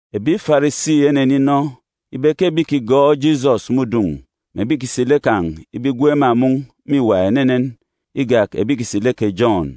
Ebi Farisi eneninọ ibe ke ebi ìkigọọk Jisọs me udun̄ mè ebi ìkisi lek kan̄ ibe igwook ema mun̄ mîwa enenen igak ebi ìkisi lek kè Jọn.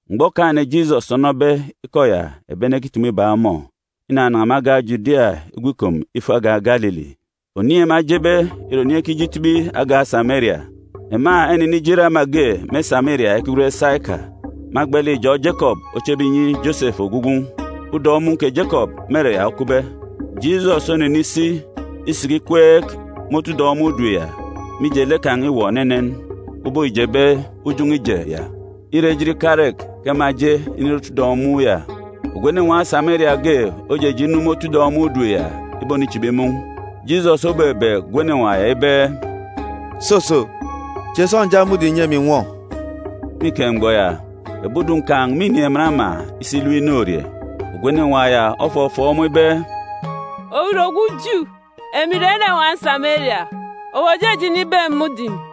Mgbọ Okaan̄-ene Jisọs onọbe ikọ ya ebi ene ekitumu ibak ọmọ, inanan̄a me agan̄ Judia igwu ikom ifo agan̄ Galili. Oniin̄ ema ejebe ìre oniin̄ ekije itibi agan̄ Sameria. Ema enenije ire ama ge me Sameria ekigwen Saika, me agba lek ijọn̄ Jekọp ochebe inyi Josefu ogwu gwun̄. Udọn̄ mun̄ kè Jekọp me ere ya okupbe. Jisọs onenisi isiki ikweek me otu udọn̄ mudim ya, mije, lek kan̄ îwọ enenen ubọk îjebe ujọn̄ọ ije ya. Îre ejit ikarek ke ema eje inire otu udọn̄ mun̄ ya. Ogwu enenwaan̄ Sameria ge ojeje inu me otu mudim ya ibonichibi mun̄. Jisọs obebeek ogwu enenwaan̄ ya ibe, “Soso, che sọnja mudim nyi emi ǹnwọ.” (Me ike mgbọ ya, ebi udun̄ kan̄ mînin̄ emen ama isi ilep inorie.) Ogwu enenwaan̄ ya ofọfọọk ọmọ ibe, “Owu ìre ogwu Ju, emi ìre enenwaan̄ Sameria. Owu òjeje inibeek emi mudim?”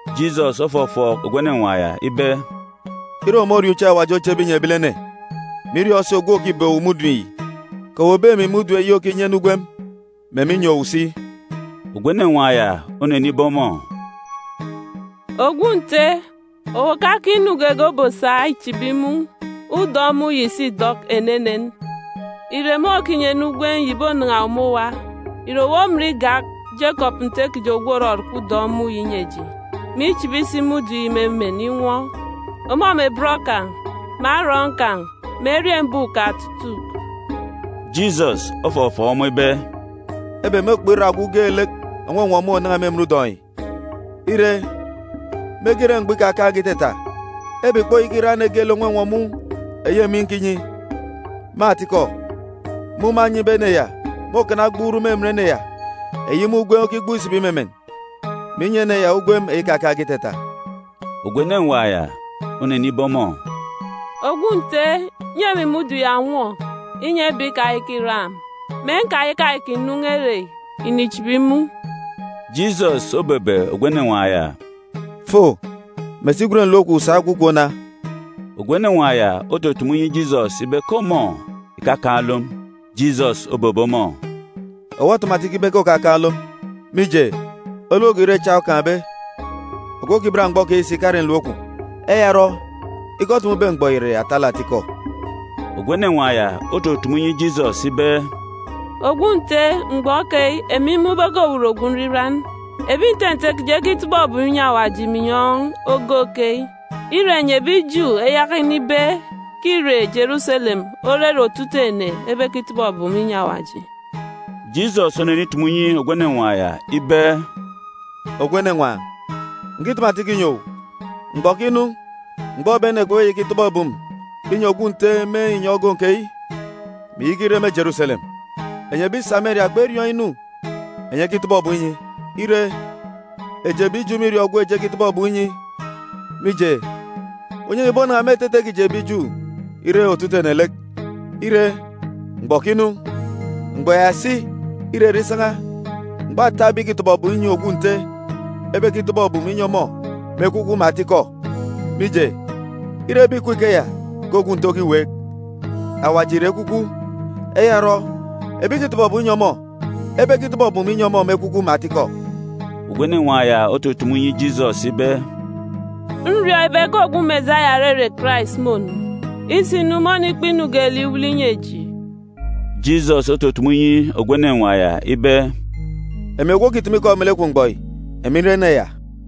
Jisọs ofọfọọk ogwu enenwaan̄ ya ibe, “Ire owu moriọọn̄ uche Awaji ochebe inyi ebilene, mè iriọọn̄ si ogwu òkibeek owu mudim yi, kè owu òbeek emi mudim eyi òkinyi ene ugwem, mè emi nnyi owu si.” Ogwu enenwaan̄ ya onenibe ọmọ, “Ogwu Nte, owu òkakaan̄ inu geege obosa ichibi mun̄. Udọn̄ mun̄ yi si îdọk enenen. Ìre mun̄ òkinyi ene ugwem yi ìbonan̄a owu me owa? Ìre owu omin igak Jekọp nte kiji ogwu òrọrọkọ udọn̄ mun̄ yi inyi eji, mè ichibi si mudim me emen inwọ, ọmọ mè bọn kan̄, mè arọọn̄ kan̄, mè eriembuuk kan̄ otutuuk?” Jisọs ofọfọọk ọmọ ibe, “Ebek môkpọk irak ogwu geelek ònwọnwọ mun̄ ònan̄a me emen udọn̄ yi. Ire, mege ire mgbọ ikakaan̄ge itata, ebek ìkpoyaka irak ene geelek ònwọnwọ mun̄ eyi emi nkinyi. Me atikọ, mun̄ mânyibe ene ya môkana ogbuuruk me emen ene ya, eyi mun̄ ugwem okigbuk isibi me emen, mè inyi ene ya ugwem eyi ikakaan̄ge itata.” Ogwu enenwaan̄ ya onenibe ọmọ, “Ogwu Nte, nyi emi mun̄ ya ǹnwọ, inyi ebek ikayaka ìrak emi, mè nkayaka ìkinu ere yi ìnichibi mun̄.” Jisọs obebe ogwu enenwaan̄ ya, “Fo, mè si gwen nlom kwun̄ sa gwu kom na.” Ogwu enenwaan̄ ya otutumu inyi Jisọs ibe ke ọmọ ìkakaan̄ olom. Jisọs obebe ọmọ, “Owu otumu atikọ ibe ke òkakaan̄ olom. Mije, olom go ire echa okaan̄be. Ogwu okibat mgbọ keyi si ìkare nlom kwun̄. Eya orọ, ikọ otumube mgbọ yi ìre atalek atikọ.” Ogwu enenwaan̄ ya otutumu inyi Jisọs ibe, “Ogwu Nte, mgbọ keyi, emi mmun̄ ibe ke owu ìre ogwu nriran. Ebi nte nte kiji ekitọbọ ebum inyi Awaji me inyọn̄ ogoon̄ keyi, ire, enyi ebi Ju eyaka inibe ke îre Jeruselem ore ere otutuuk ene ebekitọbọ ebum inyi Awaji.” Jisọs onenitumu inyi ogwu enenwaan̄ ya ibe, “Ogwu enenwaan̄, ǹkitumu atikọ inyi owu, mgbọ òkinu mgbọ ebi ene kpebeyaka ikitọbọ ebum inyi Ogwu Nte me inyọn̄ ogoon̄ keyi, mè ìyaka ire me Jeruselem. Enyi ebi Sameria kperiọọn̄ inu enyi ekitọbọ ebum inyi. Ire, eji ebi Ju mîriọọn̄ ogwu eji ekitọbọ ebum inyi, mije, unyan̄a ìbonan̄a me etete kiji ebi Ju ire otutuuk ene lek. Ire, mgbọ òkinu, mgbọ ya si îrere isan̄a, mgbọ ata ebi ìkitọbọ ebum inyi Ogwu Nte, ebekitọbọ ebum inyi ọmọ me ekwukwu mè atikọ. Mije, îre ebi ìkup ikeya ke Ogwu Nte okiweek. Awaji ìre ekwukwu. Eya orọ, ebi ìkitọbọ ebum inyi ọmọ ebekitọbọ ebum inyi ọmọ me ekwukwu mè atikọ.” Ogwu enenwaan̄ ya otutumu inyi Jisọs ibe, “Nriọọn̄ ibe ke ogwu Mesaya (òrere Karais) mônu. Isinu, mônikpa inu geelek iwele inyi eji.” Jisọs otutumu inyi ogwu enenwaan̄ ya ibe, “Emi ogwu òkitumu ikọ melek kwun̄ mgbọ yi, emi nre ene ya.”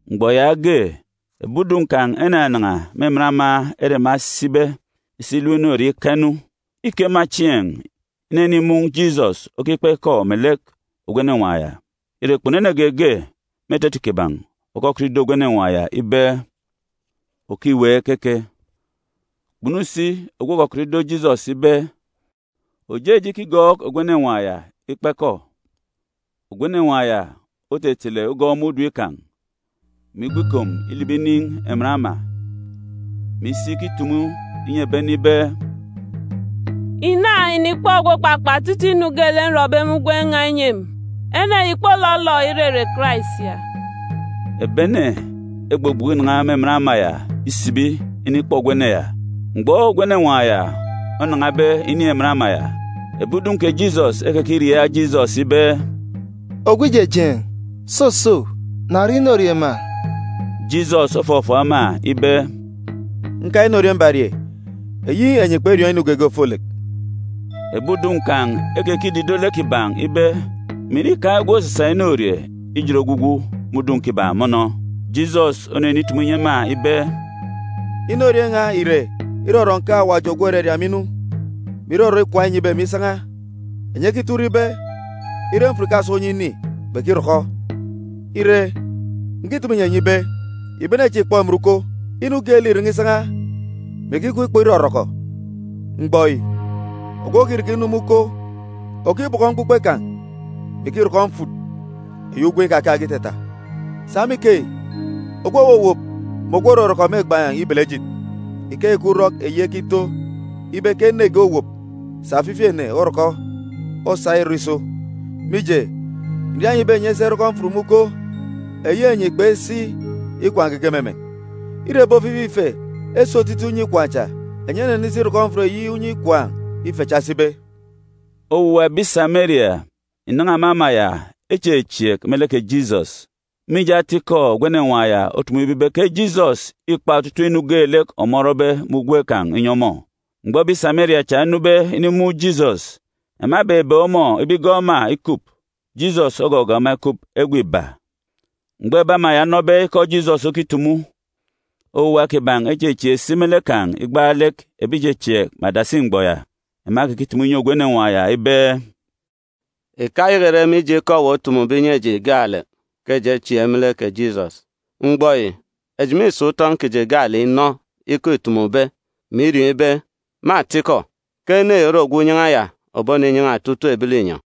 Mgbọ yaage, ebi udun̄ kan̄ enanan̄a me emen ama ere ema esibe isi ilep inorie ika inu. Îke ema chieen̄ inenimun̄ Jisọs okikpa ikọ melek ogwu enenwaan̄ ya. Ire, kpunu ene geege me etete kiban̄ òkọkọt ido ogwu enenwaan̄ ya ibe, “Òkiweek keke?” Kpunu si ogwu òkọkọt ido Jisọs ibe, “Òjeje ikigọọk ogwu enenwaan̄ ya ikpa ikọ?” Ogwu enenwaan̄ ya otetele ugọn̄ mudim kan̄, mè igwu ikom ilibi inin̄ emen ama, mè isi ikitumu inyi ebi ene ibe, “Ìna, ìnikpọ ogwu òkpakpa otutuuk inu geelek nrọbe me ugwem n̄a inyi emi. Ene yi ìkpolọlọ irere Karais ya!” Ebi ene egbugbuku inan̄a me emen ama ya isibi inikpọ ogwu ene ya. Mgbọ ogwu enenwaan̄ ya onan̄abe inin̄ emen ama ya, ebi udun̄ kè Jisọs ekekiriaak Jisọs ibe, “Ogwu Ijejeen̄, soso, na rie inorie ma!” Jisọs ofọfọọk ema ibe, “Nkaan̄ inorie mbarie eyi enyi kperiọọn̄ inu geege ofolek.” Ebi udun̄ kan̄ ekekidido lek kiban̄ ibe mè ìre îkaan̄ ogwu òsasa inorie ijet ogwugwu me udun̄ kiban̄ mọnọ? Jisọs onenitumu inyi ema ibe, “Inorie n̄a ìre irọrọ nkeek Awaji ogwu òraria emi inu, mè irọrọ ikwaan̄ înyibe emi isan̄a. Enyi ekito urọk ibe, ire mfut ìkaso onyan̄ ini, kpekirọkọ. Ire, ǹkitumu inyi enyi ibe, ìbene chieen̄ ìkpọ emen uko. Inu geelek îren̄e isan̄a, mè ikikup ikpọ irọrọkọ. Mgbọ yi, ogwu òkirọkọ inu me uko òkibọkọ mkpukpe kan̄, mè ikirọkọ mfut eyi ugwem ikakaan̄ge itata. Sa me ikeyi, ogwu òwowop mè ogwu òrọrọkọ mêgbaan̄ ibele ejit. Ikeyi ke urọk eyi ekito ibe ke ene ge owop, sà ofifi ene orọkọ, osa ìrọ iso. Mije, ǹria enyi ibe enyi esi erọkọ mfut me uko eyi enyi kpesi ikwaan̄ geege me emen. Îre ebi ofifi ife esi otutuuk unye ikwaan̄ cha, enyi enenisi irọkọ mfut eyi unye ikwaan̄ ife cha esibe.” Owuwa ebi Sameria ìnan̄a me ama ya echechieek me lek kè Jisọs, mije ata-ikọ ogwu enenwaan̄ ya otumube ibe ke Jisọs îkpa otutuuk inu geelek ọmọ orọbe me ugwem kan̄ inyi ọmọ. Mgbọ ebi Sameria cha enube inimun̄ Jisọs, ema ebebeek ọmọ ibe igọọk ema ikup. Jisọs ogọgọọk ema ikup egwe iba. Mgbọ ebi ama ya enọbe ikọ Jisọs okitumu, owuwa kiban̄ echechieek si me lek kan̄ igbaalek ebi ìchechieek me adasi mgbọ ya. Ema ekekitumu inyi ogwu enenwaan̄ ya ibe, “Ìkayaka ìre mije ikọ owu otumube inyi eji gaalek ke eji echieek me lek kè Jisọs. Mgbọ yi, eji mîsa utọn̄ kiji gaalek inọ ikọ îtumube, mè iriọọn̄ ibe, me atikọ, ke ene yi ore Ogwu Unyan̄a ya òboninyan̄a otutuuk ebi linyọn̄.”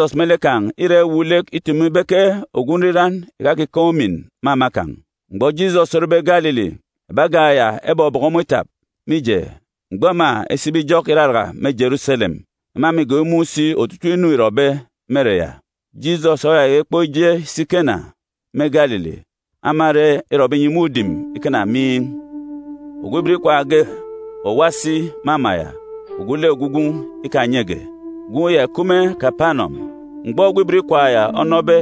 (Jisọs me lek kan̄ îra iwuuk lek itumu ibe ke ogwu nriran ìkakikaan̄ umin me ama kan̄.) Mgbọ Jisọs orebe Galili, ebi agan̄ ya ebọbọkọ ọmọ itap, mije, mgbọ ema esibe ijọk Iraraka me Jeruselem, ema mîgọọk imun̄ si otutuuk inu îrọbe me ere ya. Jisọs oyayaka ikpọk ije isi Kena, me Galili, ama ere îrọbe inyi mudim ikana miin̄. Ogwu ibot ikwaan̄ ge òwa si me ama ya ogwu lek ogwu gwun̄ ikanyege. Gwun̄ ya ìkup me Kapanọm. Mgbọ ogwu ibot ikwaan̄ ya onọbe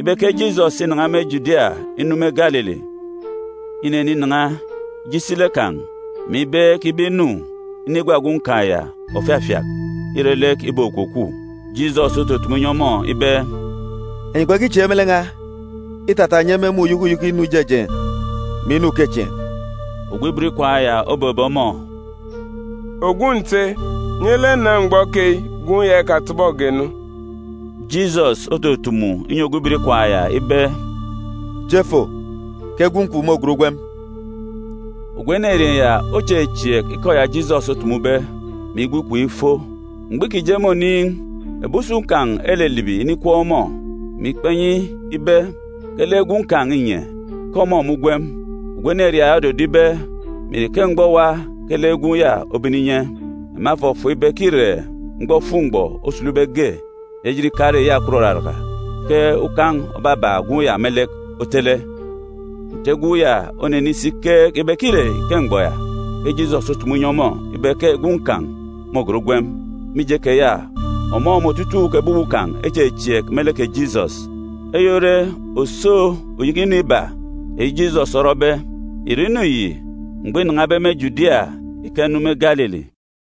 ibe ke Jisọs înan̄a me Judia inu me Galili, ineninan̄a ije isi lek kan̄, mè ibeek ibe inu inigwa gwun̄ kan̄ ya òfafiak ire lek îbokwukwu. Jisọs otutumu inyi ọmọ ibe, “Enyi kpekichieek me lek n̄a, îtata enyi emumun̄ uyeke uyeke inu ijejeen̄, mè inu ukechieen̄.” Ogwu ibot ikwaan̄ ya obebe ọmọ, “Ogwu Nte, nye lek na mgbọ keyi gwun̄ ya ikatọbọge nu.” Jisọs otutumu inyi ogwu ibot ikwaan̄ ya ibe, “Je fo, ke gwun̄ kwun̄ môgat ugwem.” Ogwu enerieen̄ ya ochechieek ikọ ya Jisọs otumube, mè igwu ikom ifo. Mgbọ îkije me oniin̄, ebi usun̄ kan̄ elilibi inikweek ọmọ, mè ikpa inyi ibe ke lek gwun̄ kan̄ înye; ke ọmọ me ugwem. Ogwu enerieen̄ ya ododo ibe mè ìre ike mgbọ owa ke lek gwun̄ ya obene inye? Ema efọfọọk ibe ke îre mgbọ òfuk-mgbọ osulube ge eyi ejit ikarek iyakwut òraraka ke ukan̄ òbabak gwun̄ ya me lek otele. Nte gwun̄ ya onenisi ikeek ibe ke îre ike mgbọ ya ke Jisọs otumu inyi ọmọ ibe ke gwun̄ kan̄ môgat ugwem. Mije keya, ọmọ mè otutuuk ebi uwu kan̄ echechieek me lek kè Jisọs. Eyi ore òso uyeke inu iba eyi Jisọs orọbe. Ìrọ inu yi mgbọ înan̄abe me Judia ika inu me Galili.